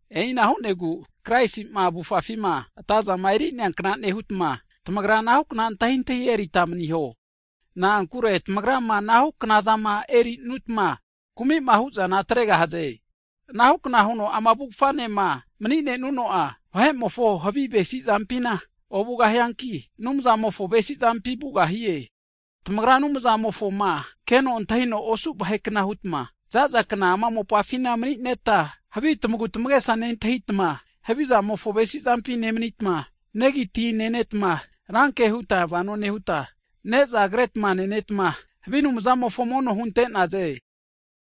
E'ina hu'negu Kraisi'ma avufafima atazama eri'neankna nehutma, tamagra anahukna antahintahi erita maniho, na'ankure tamagrama anahu knazama erinutma kumi'ma huzana atregahaze. Anahukna huno ama avufganema mni'nenuno'a, vahe'mofo havi avesizampina ovugahianki, Anumzamofo avesizampi vugahie. Tamagra Anumzamofoma keno antahino osu vahekna hutma, zaza kna ama mopafina mni'neta, havi tamagu tamagesa nentahitma, havizamofo avesizampi nemanitma, negi tina nenetma, ranke huta vano nehuta, neza kretma nenetma, havi anumzamofo mono hunte'naze.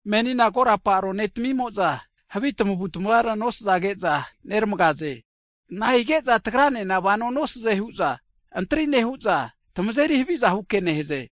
Menina korapa arone timimo'za havi tamavutamavara nosazage'za neramage'za, nahige'za tagranena vano nosaze hu'za antri nehu'za, tmazeri haviza huke nehaze.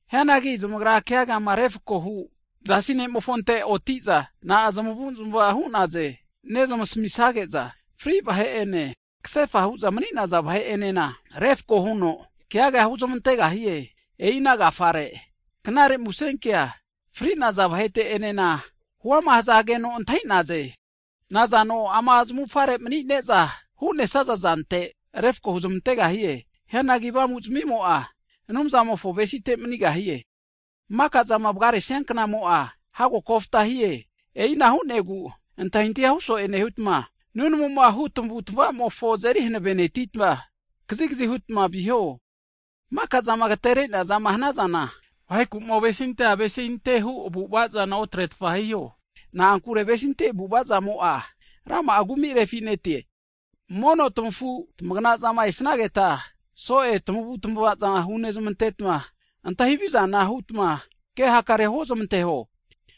Hianagi zamagra keagama refkoma hu Jasi nemofonte oti'za, nankna zmavu'zmava hu'nenazana nesamisage'za, fri vahe ene kasefa hu'za mni'naza vahe'enena refko huno keaga huzmantegahie. E'i ana agafare knare musenkea fri'naza vahete'enena huama hazage'za antahi'naze. Nazano ama zamufare mni'ne'za hu'nesaza zante refko huzmantegahie. Hianagi avamu'zmimo'a, Anumzamofo avesite manigahie. Makazama vgaresia knamo'a, hago kofta hie, e'ina hu'negu antahintahia hu so'e nehutma, nunamuma hu tamavutamavamofo azeri hanavenetita, kazigazi hutma viho. Makazama agatere'neazama hanazana, vaheku'ma ovesinte avesinte hu avu'avazana otretfa hiho, na'ankure avesinte avu'avazamo'a, rama'a kumi refinete. Mono tamafu tamagnazama esageta, so'e tamavutamavaza hunezmantetma, antahi havizana hutma ke hakarea huozmanteho.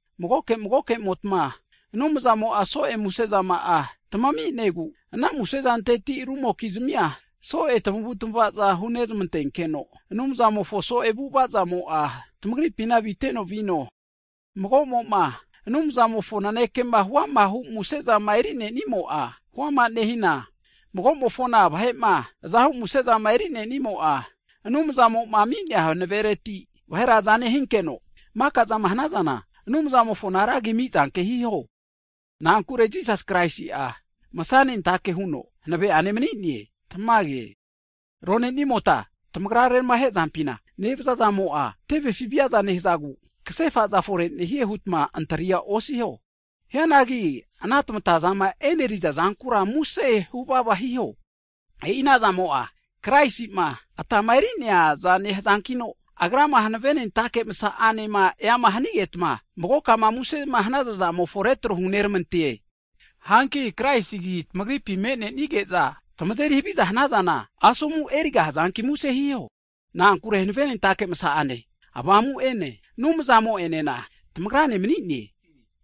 Magoke magokemotma Anumzamo'a so'e musezama'a taminegu, ana musezanteti rumokizmia so'e tamavutamavaza hunezmantenkeno Anumzamofo so'e avu'avazamo'a, tamagripina aviteno vino. Magomo'ma Anumzamofo nanekema huamahu musezama eri'nenimo'a, huama nehina, mago'mo'ma vahe'ma azahu musezama eri'nenimo'a, Anumzamo'ma ami'nea hanavereti vahera aza nehinketa, makazama hanazana Anumzamofoma ra agima amizanke hiho. Na'ankure Jisas Kraisi'a masnentake huno hanave'ane mni'ne. Tamage. Ronenimota tamagra reramahe zampima nevazazamo'a, tevefi viaza nehazagu kasefaza fore nehie hutma antria osiho. Hianangi ana tamatazama e'neriza zankura muse huvava hiho. E'i anazamo'a Kraisi'ma atama eri'neaza nehazankino, Agrama hanavenentake masa'ane eama hanigetma, magokama muse hanaza zamofo retro huneramante. Hanki Kraisi agi tamagripi me'nenige'za, tamazeri haviza hanazana, asomu erigahazanki muse hiho. Na'ankure hanavenentake msa'ane Avamu'ene Anumzamo'enena tamagrane mani'ne.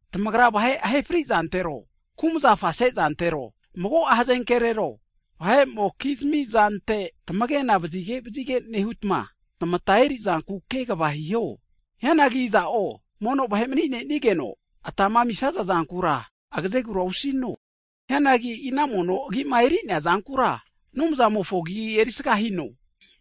Tamagra vahe ahefrizantero, kumazafa sezantero, mago'a hazenkerero, vahe'mokizmi zante tamagena vazigevazige nehutma, tamata erizanku kegva hiho. Hianagi iza'o mono vahe'ma mni'nenigeno, atama amisaza zankura agazegura osino. Hianagi e'i ana mono agima eri'neazankura, Anumzamofo agi erisaga hino.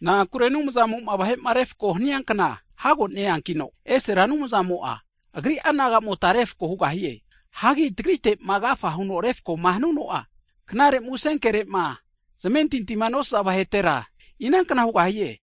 Na'ankure Anumzamo'ma vahe'ma refko hania kna hago neankino, esera Anumzamo'a Agri'a nagamota refko hugahie. Hanki tagritema agafama huno refkoma hanuno'a, knare musenkerema zamentintima nosaza vahetera, inankna hugahie.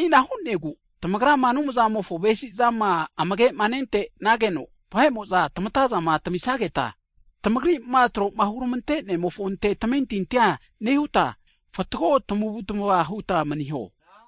E'ina hu'negu tamagrama Anumzamofo avesizama amage'ma nentenageno, vahe'mo'za tamatazama tamisageta, tamagri'ma tro'ma hurmante'nemofonte tamentintia nehutma, fatgo tamavutamava huta maniho.